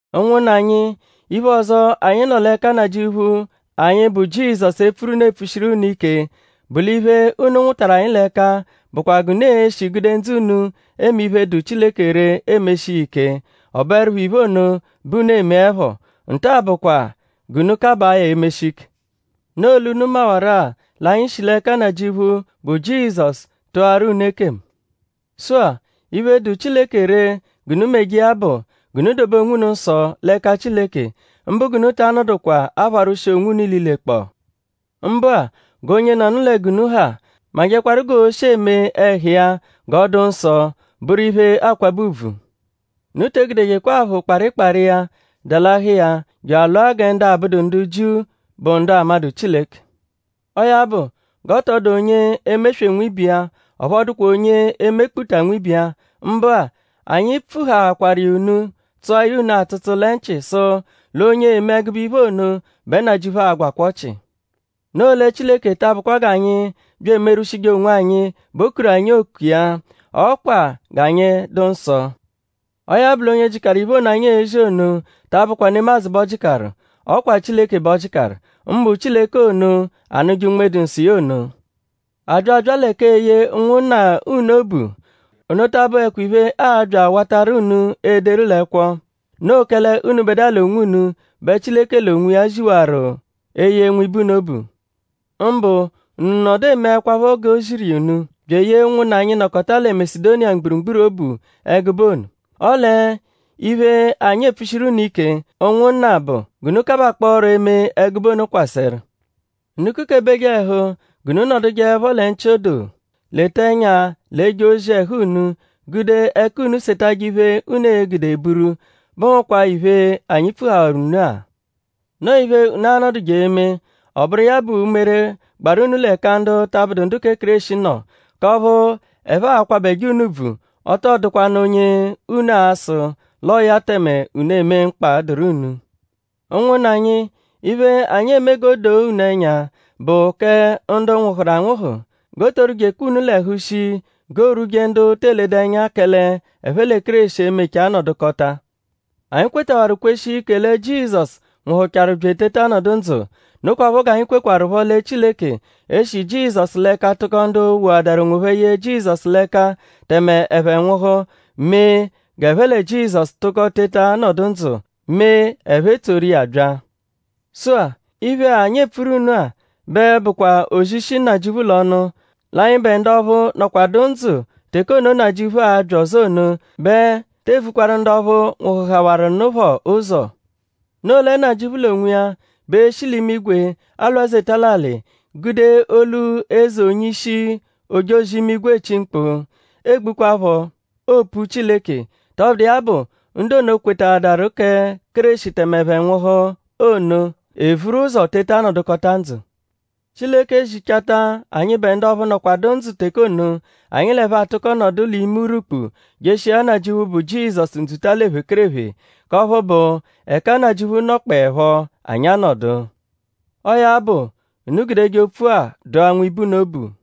Ụnwunna anyi; iphe ọzo, anyi nọ l'ẹka Nnajịuphu anyi bụ Jizọsu epfuru unu epfushiru iya unu ike bụ l'iphe, unu nwụtaru l'ẹka anyi bụkwa g'unu l'e-shi gude ndzụ unu eme iphe, dụ Chileke ree emeshi iya ike. Ọ bụerupho iphe ono bẹ unu emeẹpho. Nta-a bụkwa g'unu kabaa ya emeshi ike. Noo l'unu mawaru-a l'anyi shi l'ẹka Nnajịuphu, bụ Jizọsu tụaru unu ekemu. Sụ-a; iphe, dụ Chileke ree g'unu meje iya bụ; g'unu dobe onwunu nsọ l'ẹka Chileke; mbụ g'unu ta anọdukwa apharwụshi onwunu ililekpọo. Mbụ-a; g'onyenọnu lẹ g'unu ha majẹkwaru g'ooshi eme ẹhu iya g'ọ dụ nsọ; bụru iphe, aakwabẹ ùbvù. Unu te egudejekwa aphụ kparịkpari iya dalahụ iya je alụa gẹ ndu abụdu ndu Jiu, bụ ndu amadụ Chileke. Ọo ya bụ g'ọ tọ dụ onye e-meswe nwibe iya; ọphu ọ dụkwa onye e-mekputa nwibe iya. Mbụ-a; anyi pfuhaakwaru iya tsụa ya unu atsụtsu lẹ nchị; sụ l'onye eme ẹgube iphe ono bẹ Nnajịuphu a-gwakwa ọchi. Noo lẹ Chileke ta abụkwa g'anyi bya emerwụshije onwanyi bẹ o kuru anyi oku iya; ọ kwa g'anyi dụ nsọ. Ọo ya bụ; l'onye jịkaru iphe ono, anyi ezi ono ta abụkwa nemadzụ bẹ ọ jịkaru. Ọ kwa Chileke b'ọ jịkaru; mbụ Chileke ono, anụje Unme-dụ-Nsọ iya ono. A bya abya lẹ k'eye ụnwunna unu obu; ono ta abụhekwa iphe, aa-bya awatarụ unu ederu l'ẹkwo. Noo kẹle unubẹdua l'onwunu bẹ Chileke l'onwiya ziwaru eye nwibe unu obu. Mbụ unu nọdu emeẹkwapho g'o ziru iya unu; bya eyee ụnwunna anyi, nọkota lẹ Masedoniya mgburugburu obu ẹgube ono. Ọle iphe, anyi epfushiru unu ike; ụnwunna bụ; g'unu kabakpọoro eme ẹgube ono kwasẹru. Unu kukebeje ẹhu g'unu nọdujeepho lẹ nchị odoo; leta ẹnya l'eje ozi ẹhu unu; gude ẹka unu setajẹ iphe, unu e-gude buru, bụhukwaa iphe, anyi pfuhawaru unu-a. Noo iphe unu a-nọduje eme: ọ bụru iya bụ umere, gbaru unu l'ẹka ndu ta abụdu ndu kẹ Kéreshi nọ; k'ọphu ẹphe a-kwabẹje unu ùbvù; ọ tọ dụkwanu onye unu a-sụ l'ọo ya tẹme unu emee mkpa, dụru unu. Ụnwunna anyi; iphe, anyi eme g'o doo unu ẹnya bụ kẹ ndu nwụhuru anwụhu; g'oo-too rwujekwanụ unu l'ẹhu shii g'oorwuje ndu te eledu ẹnya kẹle ẹphe lẹ Kéreshi emecha nọdukota. Anyi kwetawaru kweshia ike lẹ Jizọsu nwụhuchaaru bya eteta nọdu ndzụ. Nokwaphọ g'anyi kwekwarụpho lẹ Chileke e-shi Jizọsu l'ẹka tụko ndu woadaru onwophẹ ye Jizọsu l'ẹka tẹme ẹphe nwụhu mee g'ẹphe lẹ Jizọsu tụko teta nọdu ndzụ; mee ẹphe etsoru iya bya. Sụ-a; iphe-a, anyi epfuru unu-a bẹ bụkwa ozi, shi Nnajịuphu l'ọnu; l'anyịbe ndu ọphu a-nọdukwadua ndzụ teke ono, Nnajịuphu a-bya ọzo ono; bẹ tee vukwaru ndu ọphu nwụhuhawaru nụ phọ ụzo. Noo lẹ Nnajịuphu l'onwiya bẹ e-shi l'imigwe alwazeta l'alị; gude olu eze onye-ishi ojozi-imigwe echi mkpu; egbukwaphọ opu Chileke. Tọbudu iya bụ; ndu ono kwetaadaru kẹ Kéreshi tẹme ẹphe nwụhu ono evuru ụzo teta nọdukota ndzụ. Chileke ezichata anyịbe ndu ọphu nọkwadu ndzụ teke ono; anyi l'ẹphe atụko nọdu l'ime urwukpu jeshia Nnajịuphu, bụ Jizọsu ndzuta l'ephekerephe k'ọphu bụ; ẹka Nnajịuphu nọkpoepho; anyi anọdu. Ọo ya bụ; unu gudeje opfu-a dụa nwibe unu obu.